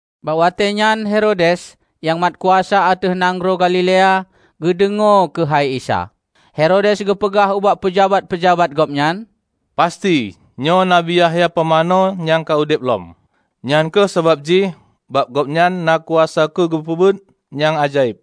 Bak watée nyan Herodes, nyang mat kuasa ateueh nanggroe Galilea, geudeungoe keuhai Isa. Herodes geupeugah ubak peujabat-peujabat gobnyan, "Pasti nyoe Nabi Yahya Pumanö nyang ka udeb lom! Nyan kheueh sabab jih bak Gobnyan na kuasa keu geupeubuet nyang ajaéb."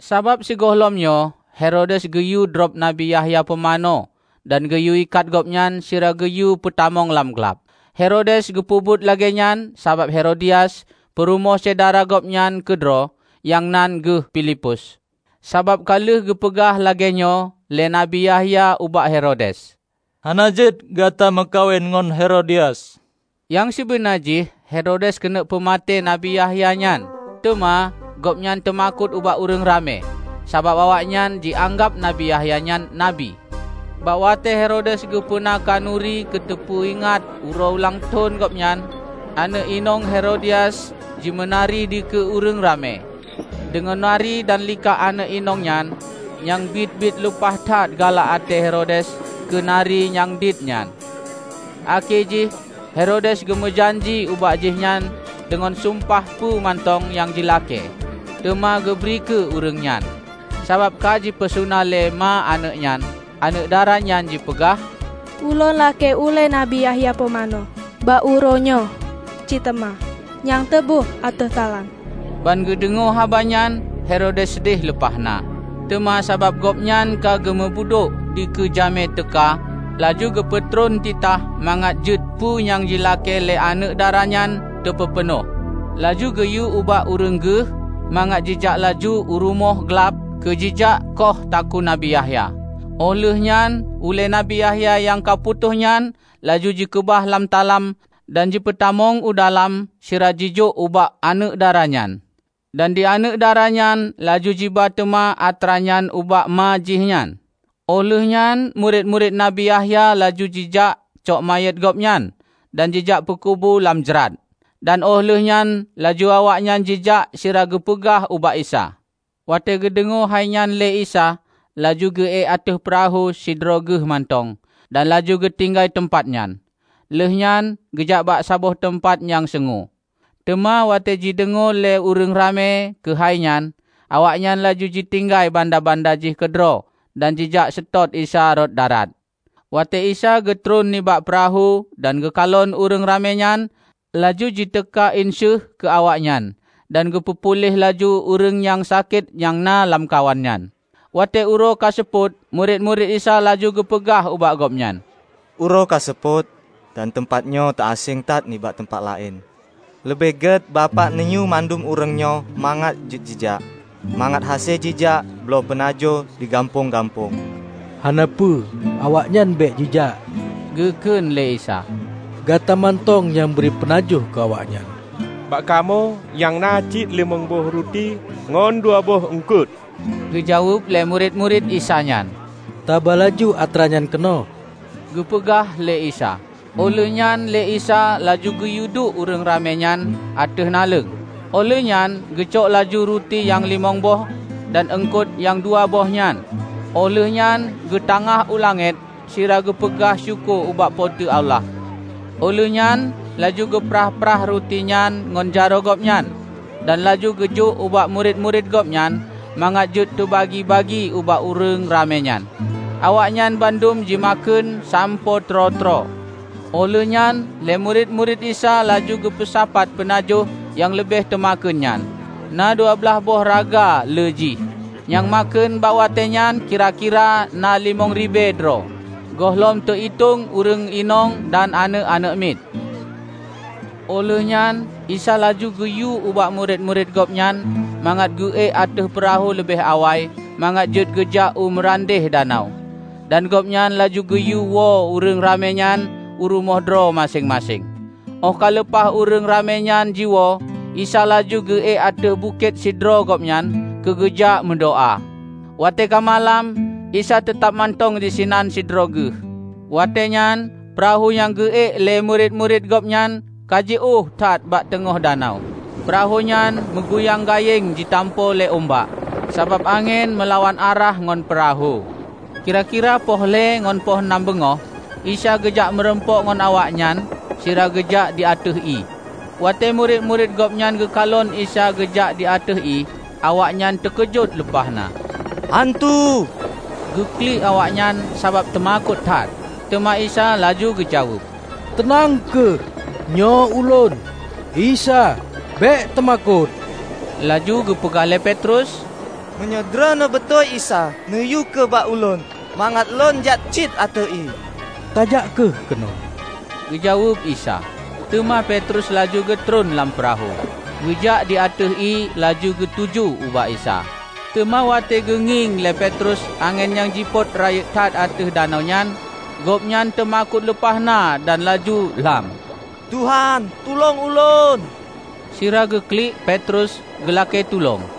Sabab sigohlom nyoe Herodes geuyue drob Nabi Yahya Pumanö dan geuyue ikat gobnyan sira geuyue peutamong lam glab. Herodes geupeubuet lagée nyan sabab Herodias, peurumoh syedara gobnyan keudroe, nyang nan geuh Pilipus. Sabab ka lheueh geupeugah lagée nyoe lé Nabi Yahya ubak Herodes, "Hana jeuet gata meukawen ngon Herodias!" Nyang sibeuna jih Herodes keuneuk peumaté Nabi Yahya nyan, teuma gobnyan teumakot ubak ureuëng ramé, sabab awaknyan ji-anggab Nabi Yahya nyan nabi. Bak watée Herodes geupeuna khanuri keu teupeu ingat uroe ulang thon gobnyan, aneuëk inong Herodias jimeunari dikeue ureuëng ramé. Deungon nari dan likak aneuëk inong nyan, nyang biet-biet lumpah that galak até Herodes keu nari nyang diet nyan, akhé jih Herodes geumeujanji ubak jihnyan deungon sumpah peue mantong nyang jilakée, teuma geubri keu ureuëng nyan. Sabab ka jipeusuna lé ma aneuëk nyan, aneuëk dara nyan jipeugah, "Ulôn lakée ulée Nabi Yahya Pumanö bak uroe nyoe cit teuma nyang teuba ateueh talam!" Ban geudeungoe haba nyan, Herodes seudeh lumpah na. Teuma sabab gobnyan ka geumeubudôk dikeue jamé teuka, laju geupeutron titah mangat jeuet peue nyang jilakée lé aneuëk dara nyan teupeupeunoh. Laju geuyue ubak ureuëng geuh mangat jijak laju u rumoh glab keu jijak khoh takue Nabi Yahya. Óh lheueh nyan ulée Nabi Yahya nyang ka putôh nyan laju jikeubah lam talam dan jipeutamong u dalam sira jijok ubak aneuëk dara nyan. Dan di aneuëk dara nyan laju jiba teuma atra nyan ubak ma jihnyan. Óh lheueh nyan murit-murit Nabi Yahya laju jijak cok manyét gobnyan dan jijak peukubu lam jrat. Dan óh lheueh nyan laju awaknyan jijak sira geupeugah ubak Isa. Watée geudeungoe hai nyan lé Isa, laju geu-ék ateueh peurahô sidroe Geuh mantong dan laju geutinggai teumpat nyan, lheueh nyan geujak bak saboh teumpat nyang seungue. Teuma watée jideungoe lé ureuëng ramé keuhai nyan, awaknyan laju jitinggai banda-banda jih keudroe dan jijak seutôt Isa rot darat. Watée Isa geutron nibak peurahô dan geukalon ureuëng ramé nyan, laju jiteuka inseuh keu awaknyan, dan geupeu puléh laju ureuëng nyang sakét nyang na lamkawan nyan. Watée uroe ka seupôt, murit-murit Isa laju geupeugah ubak Gobnyan, "Uroe ka seupôt dan teumpat nyoe teu-aséng that nibak teumpat laén. Leubeh gét Bapak neuyue bandum ureuëng nyoe mangat jeuet jijak, mangat hase jijak bloe peunajoh di gampông-gampông." "Hana peue, awaknyan bék jijak," geu kheun lé Isa, "Gata mantong nyang bri peunajoh keu awaknyan." "Bak kamoe nyang na cit limong boh ruti ngon dua boh eungkot!" geujaweueb lé murit-murit Isa nyan. "Taba laju atra nyan keunoe," geupeugah lé Isa. Óh lheueh nyan lé Isa laju geuyueduek ureuëng ramé nyan ateueh naleueng. Óh lheueh nyan geucok laju ruti nyang limong boh dan eungkot nyang dua boh nyan, óh lheueh nyan geutangáh u langét sira geu peugah syukoe ubak Po teu Allah. Óh lheueh nyan laju geuprah-prah ruti nyan ngon jaroe Gobnyan dan laju geujok ubak murit-murit Gobnyan mangat jeuet teubagi-bagi ubak ureuëng ramé nyan. Awaknyan bandum jimakheun sampoe troe-troe. Óh lheueh nyan lé murit-murit Isa laju geupeusapat peunajoh nyang leubeh teumakheun nyan; na dua blaih boh raga lé jih. Nyang makheun bak watée nyan kira-kira na limong ribée droe, gohlom teu-itong ureuëng inong dan aneuëk-aneuëk miet. Óh lheueh nyan Isa laju geuyue ubak murit-murit Gobnyan mangat geu-ék ateueh peurahô leubeh awai mangat jeuet geujak u meurandeh danau, dan Gobnyan laju geuyue woe ureuëng ramé nyan u rumoh droe maséng-maséng. Óh ka leupah ureuëng ramé nyan jiwoe, Isa laju geu-ék ateueh bukét sidroe Gobnyan keu geujak meudoá. Watée ka malam, Isa teutab mantong disinan sidroe Geuh. Watée nyan peurahô nyang geu-ék lé murit-murit Gobnyan ka jiôh that bak teungoh danau. Peurahô nyan meuguyang gayeng jitampo lé umbak, sabab angén meulawan arah ngon peurahô. Kira-kira poh lhée ngon poh nam beungoh, Isa geujak meurumpok ngon awaknyan sira geujak di ateueh ié. Watée murit-murit Gobnyan geukalon Isa geujak di ateueh ié, awaknyan teukeujot lumpah na, "Hantu!" geuklik awaknyan sabab teumakot that. Teuma Isa laju geujaweueb, "Teunang kheueh! Nyoe Ulôn, Isa. Bék teumakot!" Laju geupeugah lé Petrus, "Meunyoe Droeneueh beutôi Isa, neuyue kheueh bak ulôn mangat lôn jak cit ateueh ié." "Tajak kheueh keunoe," geujaweueb Isa. Teuma Petrus laju geutron lam peurahô, geujak di ateueh ié laju geutuju ubak Isa. Teuma watée geungieng lé Petrus angén nyang jipot rayeuk that ateueh danau nyan, gobnyan teumakot lumpah na dan laju lham. "Tuhan, tulông lôn!" sira geuklik Petrus geulakée tulông.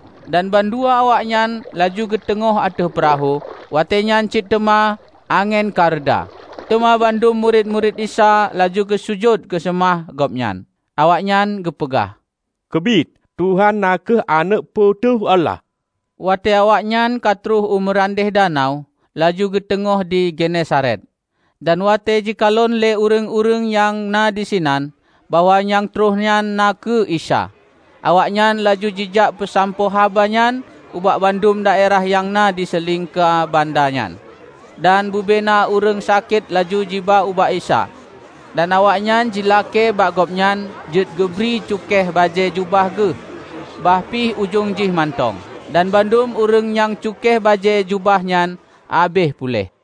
Dan ban dua awaknyan laju geuteungoh ateueh peurahô, watée nyan cit teuma angén ka reuda. Teuma bandum murit-murit Isa laju geusujut geuseumah Gobnyan. Awaknyan geupeugah, "Keubiet, Tuhan na kheueh Aneuëk Po teu Allah!" Watée awaknyan ka troh u meurandeh danau, laju geuteungoh di Genesaret. Dan watée jikalon lé ureuëng-ureuëng nyang na disinan bahwa nyang trok nyan na kheueh Isa, awaknyan laju jijak peusampoe haba nyan ubak bandum daerah nyang na di silingka banda nyan. Dan bubena ureuëng sakét laju jiba ubak Isa. Dan awaknyan jilakée bak Gobnyan jeuet geubri cukéh bajée jubah Geuh, bah pih ujong jih mantong. Dan bandum ureuëng nyang cukéh bajée jubah nyan habéh puléh.